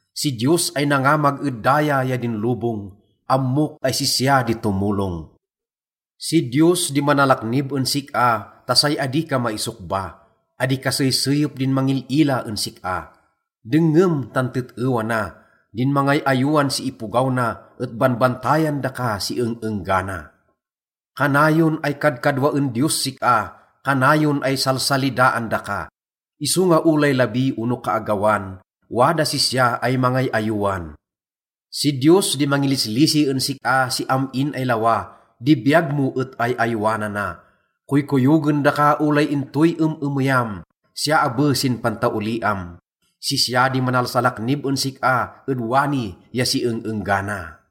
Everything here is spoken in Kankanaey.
Si Diyos ay nangamag ed daya ya din lobong, ammok ay sisya di tomolong. Si Diyos di manalaknib en sik-a ta say adi ka maisokba. Adi kaseyseyep din mangil-ila en sik-a. Dengngem tan tet-ewa na: din mangay-ayowan si ipogaw na et banbantayan daka si eng-enggana. Kanayon ay kadkadwaen Diyos sik-a, kanayon ay salsalidaan daka. Isonga olay labi ono kaagawan, wadas sisya ay mangay-ayowan. Si Diyos di mangilislisi en sik-a si am-in ay lawa, di biyag mo et ay-ayowanana. Koykoyogen daka olay intoy em-emeyam, siya abe sin pantaoliam. Sisya di manalsalaknib en sik-a ed wani ya si eng-enggana.